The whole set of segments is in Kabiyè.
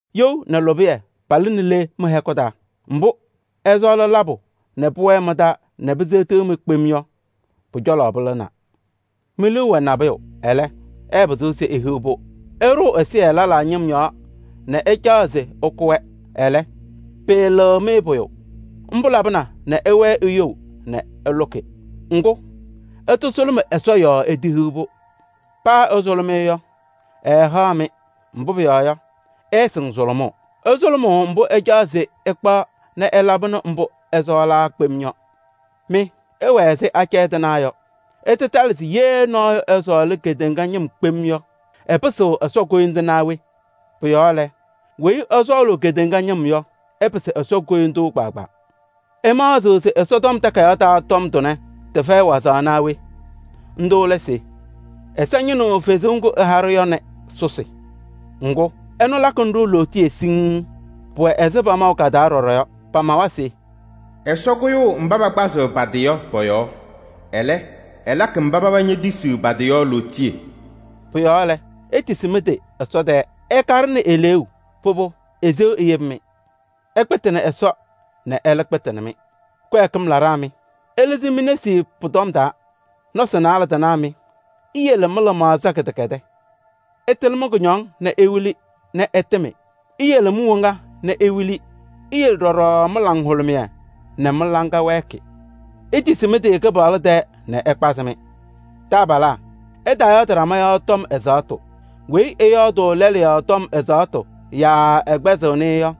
You nɛ lʋbɩyɛ palɩnɩ le mɩ-hɛkʋ taa? Mbʋ́ ɩsɔɔlɩ labʋ kpem nɛ pʋwɛɛ mɩ-taa nɛ piseɣtiɣ-mɩ yɔ, pʋ-cɔlɔ pɩlɩnaa. Mi-liu wɛ nabʋyʋ, ɛlɛ́, ɩɩpɩzɩɣ se ihiɣ-pʋ. Ɩɖʋʋ ɛsɩyɛ lɛlaa ñɩm yɔɔ nɛ ɩcaɣ se ɩkʋ-wɛ, ɛlɛ́, pɩɩlɩɣ-mɩ pʋyʋ. Ḿbʋ́ labɩna nɛ ɩwɛɛ iyou nɛ ɩlʋkɩ. Ŋgʋ́, ɩtasʋlʋmɩ Ɛsɔ yɔɔ itehiɣ-pʋ. Paa ɩsʋlʋmɩ-ɩ yɔ, ɛɛhaɣ-mɩ, mbʋ́ pʋyɔɔ yɔ, ɩɩsɩŋ sʋlʋmʋʋ: ɩsʋlʋmʋʋ mbʋ́ ɩcaɣ se ɩkpaɣ nɛ ɩlabɩnɩ mbʋ́ ɩsɔɔlaa kpem yɔ. Mɩ, ɩwɛ ɛzɩ acɛyɛ tɩnaa yɔ! Ɩtatɩlɩ se yee nɔɔyʋ ɛsɔɔlɩ kedeŋa ñɩm kpem yɔ, ɛpɩsɩɣ Ɛsɔ koyindu naa we? Pʋ-yɔɔ lɛ, weyi ɛsɔɔlʋʋ kedeŋa ñɩm yɔ, ɛpɩsɩɣ Ɛsɔ koyindu kpaagbaa. Ɩmaɣzɩɣ se Ɛsɔtɔm Takayaɣ taa tɔm tʋnɛ, tɩfɛyɩ wazaɣ naa we? Ńdʋ́ lɛ se: “Ɛsɔ ñɩnɩɣ fezuu ŋgʋ́ ɛha-ɖʋ yɔ nɛ sʋsɩ.” Ŋgʋ́, ɛnʋ lakɩnɩ-ɖʋ lootiye siŋŋ. Pʋwɛ ɛzɩ pamaʋ ka-taa ɖɔɖɔ yɔ. Pamawa se: “Ɛsɔ kʋyʋʋ mbá pakpazɩɣ pa-tɩ yɔ pɔ-yɔɔ. Ɛlɛ́, ɛlakɩ mbá paba ñetisiɣ pa-tɩ yɔ lootiye.” Pʋ-yɔɔ lɛ, itisi mɩ-tɩ Ɛsɔ tɛɛ. Ɩkaɖɩnɩ eleeu, pʋbʋ, eseɣ eyebi-mɩ. Ɩkpɩtɩnɩ Ɛsɔ nɛ ɛ́lɛ́ kpɩtɩnɩ-mɩ. Kɩwɛɛkɩm laɖaa mɩ! Ɩlɩzɩ mi-nesi pʋ-tɔm taa. Nɔsɩ naalɛ tɩnaa mɩ! Iyele mɩ-lɩmaɣza kɩdɛkɛdɛɛ. Ɩtɩlɩ mɩ-kʋñɔŋ nɛ iwili nɛ ɩtɩmɩ. Iyele mi-woŋa nɛ iwili, iyele ɖɔɖɔ mɩ-laŋhʋlʋmɩyɛ nɛ mɩ-laŋa wɛɛkɩ. Itisi mɩ-tɩ Kɩpaɣlʋ tɛɛ nɛ ɛkpazɩ-mɩ. Taabalaa! Ɩtaayɔɔdɩ ɖama yɔɔ tɔm ɛzaɣ́tʋ. Weyi ɛyɔɔdʋʋ lɛlʋ yɔɔ tɔm ɛzaɣ́tʋ yaa ɛkpɛzɩɣnɩ-ɩ yɔ,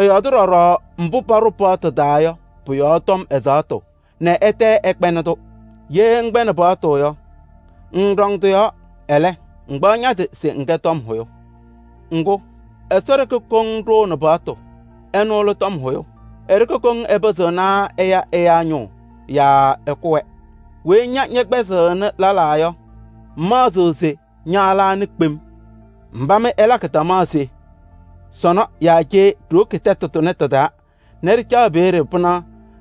ɛyɔɔdɩ ɖɔɖɔ mbʋ́ paɖʋ paɣtʋ taa yɔ pʋ-yɔɔ tɔm ɛzaɣ́tʋ nɛ ɛtɛ ɛkpɛɛnɩ-tʋ. Yee ŋkpɛɣnɩ paɣtʋ yɔ, ŋŋɖɔŋ tɩ-yɔɔ, ɛlɛ́, ŋkpaɣ ña-tɩ se ŋkɛ tɔm hʋyʋ. Ŋgʋ́, Ɛsɔ ɖeke koŋ ɖʋʋnɩ paɣtʋ, ɛnʋ lɛ tɔm hʋyʋ. E-ɖeke koŋ ɛpɩzɩɣnɩ ɛya ɛyáa ñʋʋ yaa ɛkʋ-wɛ. Weyi ña ñɛkpɛzɩɣnɩ lɛlaa yɔ, ŋmaɣzɩɣ se ña lɛ anɩ kpem? Mbá mɩ ɩlakɩ tamaɣ se: “Sɔnɔ yaa cee ɖiwoki tɛtʋ tʋnɛ tɩ-taa nɛ ɖɩcaɣ peeɖe pɩnaɣ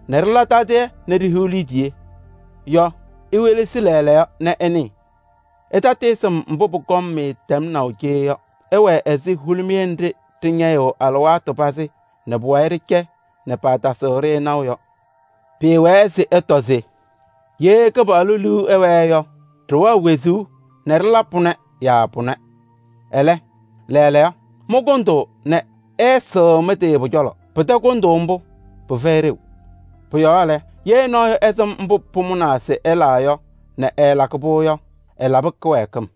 nɛ ɖɩla tadɩyɛ nɛ ɖihiɣ liidiye” yɔ, iwelesi lɛɛlɛɛyɔ nɛ ɩnɩɩ. Ɩtatɩɩsɩm mbʋ́ pʋkɔŋ-mɩ tɛmnaʋ cee yɔ! Ɩwɛ ɛzɩ hulumiye nɖɩ́ ɖɩñɛyɩɣ alɩwaatʋ pazɩ nɛ pʋwayɩ ɖɩcɛ nɛ paatasɩɣ-ɖɩ naʋ yɔ. Pɩɩwɛɛ se ɩtɔ se: “Yee Kɩpaɣlʋ liu ɛwɛɛ yɔ, ɖɩwɛɣ wezuu nɛ ɖɩla pʋnɛ yaa pʋnɛ.” Ɛlɛ́, lɛɛlɛɛyɔ, mɩ mɩkʋndʋʋ nɛ ɩɩsɩɣ mɩ-tɩ pʋ-cɔlɔ. Pɩtɛ kʋndʋʋ ḿbʋ́, pɩfɛyɩ ɖeu. Pʋ-yɔɔ lɛ, yee nɔɔyʋ ɛsɩm mbʋ́ pʋmʋnaa se ɛla yɔ nɛ ɛɛlakɩ-pʋ yɔ, ɛlabɩ kɩwɛɛkɩm.